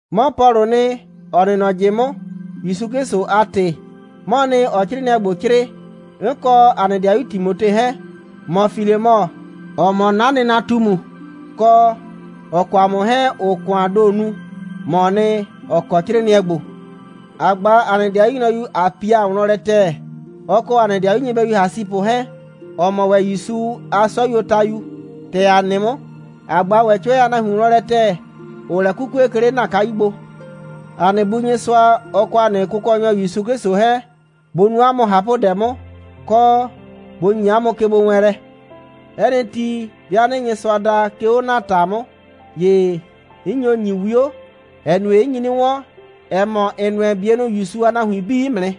'Mɔ Pɔlʋʋ nɩ, ‑ɔ nɩ nɔ ꞊jɩ 'mʋ, ‑Yusu 'Klɩsʋ a ‑tɩ, 'mɔɔ nɩ, ‑ɔɔ 'crɩɩnɩɛ ‑gbo 'crɩɩ, 'n kɔ ‑a nɩ 'dɩayu Timote 'hɛɛn. ‑Mɔ Filemɔ, ‑ɔ mɔ 'na nɩnatumu, kɔ, ‑ɔ kɔ ‑a mʋ 'hɛɛn ‑ʋʋ ‑kʋaan ‑do nu, ‑mɔɔ nɩ, ‑ɔ kɔ 'crɩɩnɩɛ ‑gbo. ‑A ꞊gba ‑a nɩ ‑dɩayu nyrɔyu Apia wlɔn lɛ ‑tɛɛ, ɔ kɔ ‑a nɩ ‑dɩayu nyɩbɛyu Asipʋ 'hɛɛn, ‑ɔ mɔ ‑wɛ ‑Yusu a 'sɔyuotayu, ‑tɛ ‑a nɩ 'mʋ. ‑A ꞊gba ‑wɛ 'cʋɛ a nahuin wlɔn lɛ ‑tɛɛ, ‑ʋʋ lɛ 'kukue, 'ke 'le ‑na kayu gbo. ‑A nɩ Bu Nyɩsʋa, ɔ kɔ ‑a nɩ Kʋkɔnyɔ ‑Yusu 'Klɩsʋ 'hɛɛn, bʋ nu 'a mʋ ꞊hapʋdɛ 'mʋ, kɔ, bʋ ‑nye 'a mʋ kegbowɛɛnlɛ. 'Ɛ nɩ ti, 'bɩa 'nɩɩ Nyɩsʋa da, 'ke 'o ‑na ‑ta 'mʋ, ‑ye 'n nyo ‑nyi 'wio, ‑ɛ nue, 'n nyi 'nɩ 'wɔn, ‑ɛ mɔ, ‑n nʋɛ ‑n 'bienʋ ‑Yusu a nahuin 'bii 'mʋ nɩ,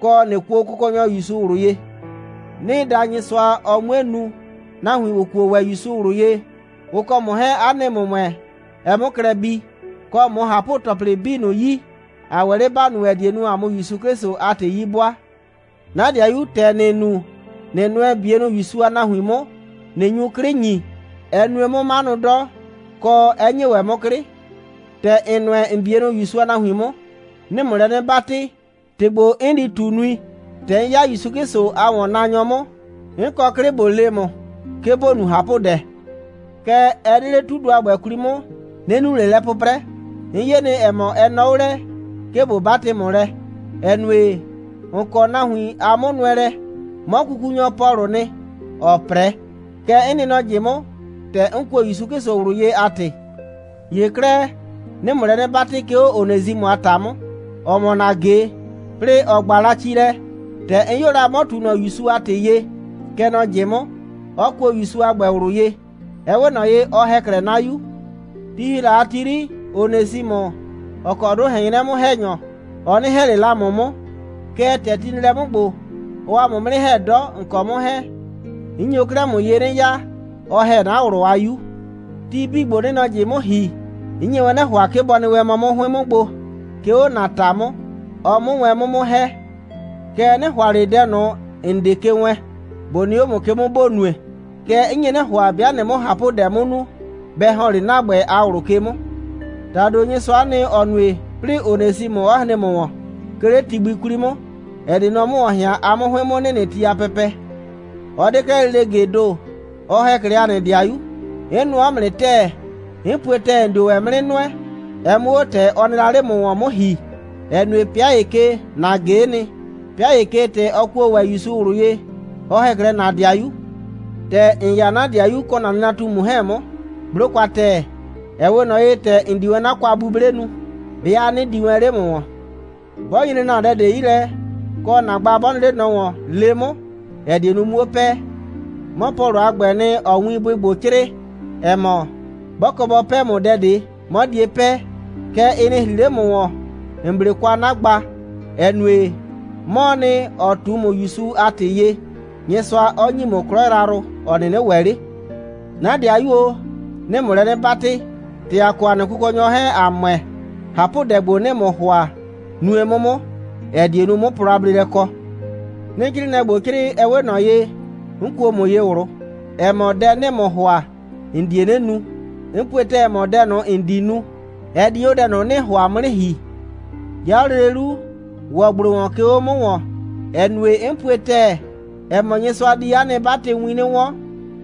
kɔ, ꞊nɩ kuo Kʋkɔnyɔ ‑Yusu ꞊wlʋ ye. 'Nɩɩ da Nyɩsʋa, ɔ 'mue nu, nahuin, ‑ʋ kuo ‑wɛ ‑Yusu ꞊wlʋ ye, ʋ kɔ ‑mʋ 'hɛɛn, 'a nɩ ‑mʋmʋɛ, ɛ 'mʋ klɛ bii, kɔ, ꞊mʋ ꞊hapʋ‑tɔplɩ 'bii ꞊nʋ yi, ‑a ‑wɛ 'le ‑ba nu, ‑ɛ die nu, ‑a 'mʋ ‑Yusu 'Klɩsʋ a ‑tɩ 'yi 'bʋaa. 'Na ‑dɩayu, ‑tɛ ‑nɩɩ nu, ꞊nɩ nʋɛ ‑n 'bienʋ ‑Yusu a nahuin 'mʋ, ꞊nɩ nyu 'klɩ ‑nyi, ɛ nue 'mʋ 'manʋ 'dɔ, kɔ, 'ɛ ‑nyi ‑wɛ 'mʋ 'klɩ. ‑Tɛ ‑n nʋɛ ‑n 'bienʋ ‑Yusu a nahuin 'mʋ, 'nɩɩ ‑mʋ lɛ 'nɩ 'batɩ, ‑tɩ ‑gbo, 'n di ꞊tu, nui. ‑Tɛ 'n 'ya ‑Yusu 'Klɩsʋ a ‑wɔnnaanyɔ 'mʋ, 'n kɔ 'klɩ, ꞊bo le ‑mʋ, 'ke ‑bo nu ꞊hapʋdɛ. Kɛɛ, ɛ 'de 'le 'tudʋ a ‑gbɛ 'kwli 'mʋ, 'nɩ nu ꞊le lɛ 'pʋprɛ. 'N 'ye nɩ, ‑ɛ mɔ, ɛ nɔɔ 'o lɛ, 'ke ꞊bo 'batɩ ‑mʋ lɛ, ‑ɛ nue, ‑n kɔ nahuin a 'mʋnʋɛlɛ. 'Mɔ kukunyɔ Pɔlʋʋ nɩ, ‑ɔɔ 'prɛ. Kɛ 'n nɩ nɔ ꞊jɩ 'mʋ, ‑tɛ 'n kuo ‑Yusu 'Klɩsʋ ꞊wlʋ ye a ‑tɩ. ‑Ye 'klɛɛ, 'nɩɩ ‑mʋ lɛ 'nɩ 'batɩ, 'ke 'o Onesimʋ a ‑ta 'mʋ, ‑ɔ mɔ ‑na ꞊ge, 'plɩɩ ‑ɔ 'gba la ci lɛ. ‑Tɛ 'n 'yo la, 'mɔ ꞊tu ꞊nɔ ‑Yusu a ‑tɩ ye, kɛ nɔ ꞊jɩ 'mʋ, 'ɔ kuo ‑Yusu a ‑gbɛ ꞊wlʋ ye. Ɛ 'we ꞊nɔ ye, ɔ ‑hɛ 'klɛɛ 'na 'yu. Ti ‑hi la a ti 'yri, Onesimʋ, ‑ɔ kɔ 'dʋ ꞊hɛn 'nyrɛ 'mʋ‑hɛnyɔ, ɔ 'nɩ ‑hɛ ꞊le la ‑mʋ 'mʋ, kɛɛ, ‑tɛ ti nɩ lɛ 'mʋ ‑gbo, ɔɔ ‑a mʋ 'mʋ 'nɩ ‑hɛ 'dɔ, ‑n kɔ 'mʋ 'hɛɛn. 'N nyo 'klɛɛ ‑mʋ ye 'nɩ ya. Ɔ ‑hɛ 'na ꞊wlʋ a 'yu. Ti 'bii ‑gbo, 'nɩɩ nɔ ꞊jɩ 'mʋ ‑hi, 'n nye wɛn 'nɩ ‑hʋa, 'ke bɔ nɩ wɛn mɔ 'mʋ 'hʋɩn 'mʋ gbo, 'ke 'o ‑na ‑ta 'mʋ, ɔ 'mʋ wɛn 'mʋ 'mʋ ‑hɛ. Kɛɛ, 'nɩ ‑hʋa ꞊le dɛ ꞊nʋ, ‑n 'de ke wɛɛn, ꞊bo nɩ 'o ‑mʋ ke 'mʋ, ‑bo nue. Kɛɛ, 'n nye 'nɩ ‑hʋa, 'bɩa ꞊nɩɩ 'mʋ ꞊hapʋdɛ 'mʋ nu, bɛ ‑hɔn 'le ‑na ‑gbɛ a ꞊wlʋ ke 'mʋ. ‑Tado Nyɩsʋa'a nɩ, ‑ɔ nue, 'plɩɩ Onesimʋ 'ɔ hren ‑mʋ ‑wɔn, 'ke 'le ti gbi 'kwli 'mʋ, ‑ɛ die nu, ɔ 'mʋ ‑wɔn ꞊hɩan, a 'mʋ 'hʋɩn 'mʋ nɩnɩ ti a pɛpɛ. Ɔ 'de 'klɛɛ lele ꞊gee ‑do, ɔ ‑hɛ 'klɛɛ ‑a nɩ ‑dɩayu. 'N nʋɔ 'mʋ nɩ ‑tɛɛ. 'N pue ‑tɛɛ, ‑n dio ‑wɛ 'mʋ 'nɩ nʋɛ, ɛ 'mʋ 'o ‑tɛ ɔ nɩ la 'le ‑mʋ ‑wɔn 'mʋ ‑hi, ‑ɛ nue, 'pɩa ‑ye ke, ‑na ꞊ge'e nɩ, 'pɩa ‑ye ke, ‑tɛ ɔ kuo ‑wɛ ‑Yusu ꞊wlʋ ye, ɔ ‑hɛ 'klɛɛ ‑na ‑dɩayu. ‑Tɛ ‑n 'ya 'na ‑dɩayu kɔ 'na nɩnatumu 'hɛɛn 'mʋ, 'blo kwa ‑tɛɛ, ‑ɛ 'we ꞊nɔ ye, ‑tɛ ‑n di wɛn 'na kwa'buble nu, 'bɩa 'nɩ di wɛn 'le ‑mʋ ‑wɔn. 'Bɔ nyre ‑na dɛ ꞊de 'yi lɛ, kɔ, ‑na gba 'bɔ nɩ 'le ꞊nɔ ‑wɔn, le 'mʋ, ‑ɛ die nu, 'muo 'pɛɛ. 'Mɔ Pɔlʋ a ‑gbɛɛ nɩ, ‑ɔɔ winbʋɩ ‑gbo 'crɩɩ, ‑ɛ mɔ: 'Bɔ kɔ bɔ 'pɛɛ ‑mʋ dɛ ꞊de, 'mɔ die 'pɛɛ. Kɛɛ, ɩ nɩ ‑hri 'le ‑mʋ ‑wɔn, ‑n 'ble kwa 'na gba, ‑ɛ nue, 'mɔɔ nɩ, ‑ɔ ꞊tu ‑mʋ ‑Yusu a ‑tɩ ye, Nyɩsʋa 'ɔ ‑nyi ‑mʋ 'klɔ yrayrʋ, ‑ɔ 'nɩnɩ ‑wɛ 'le. 'Na ‑dɩayu o, 'nɩɩ ‑mʋ lɛ 'nɩ 'batɩ, ‑tɛ ‑a kɔ ‑a nɩ Kʋkɔnyɔ 'hɛɛn, ‑a ‑mʋɛ, ꞊hapʋdɛ ‑gbo, 'nɩɩ ‑mʋ ‑hʋa, nue 'mʋ 'mʋ, ‑ɛ die nu, 'mʋ plɔ a bleelɛ kɔ. 'Nɩɩ 'crɩɩnɩɛ ‑gbo 'crɩɩ, ɛ 'we ꞊nɔ ye, 'n kuo ‑mʋ ye ꞊wlʋ, ‑ɛ mɔ, dɛ 'nɩɩ ‑mʋ ‑hʋa, ‑n die 'nɩ nu. 'N pue ‑tɛɛ, ‑ɛ mɔ, dɛ ꞊nʋ, ‑n di nu, ɛ di 'o dɛ ꞊nʋ, 'nɩɩ ‑hʋa 'mʋ 'nɩ ‑hi. 'Ya 'o lele 'lu, ‑wɔ ‑gblo ‑wɔn, 'ke 'o 'na ‑ta 'mʋ, ‑ɛ nue, 'n pue ‑tɛɛ, ‑ɛ mɔ, Nyɩsʋa di 'a nɩ 'batɩwin 'nɩ 'wɔn,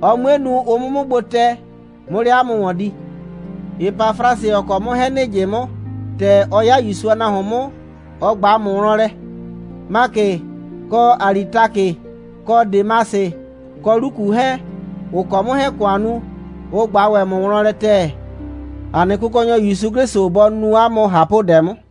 ɔ 'mue nu, ʋ 'mʋ 'mʋ gbo tɛ, 'mʋ 'le 'a mʋ ‑wɔn di. Epafrasɩ, ‑ɔ kɔ 'mʋ 'hɛɛn ‑nɩ ꞊jɩ 'mʋ, ‑tɛ ɔ 'ya ‑Yusu a nahuon 'mʋ, ɔ ꞊gba ‑mʋ wlɔn lɛ. Makɩ, kɔ Alitakɩ, kɔ Demasɩ, kɔ Luku 'hɛɛn, ‑ʋ kɔ 'mʋ 'hɛɛn ‑kʋan nu, ʋ ꞊gba ‑wɛ ‑mʋ wlɔn lɛ ‑tɛɛ. ‑A nɩ Kʋkɔnyɔ ‑Yusu 'Klɩsʋ bɔ nu 'a mʋ ꞊hapʋdɛ 'mʋ.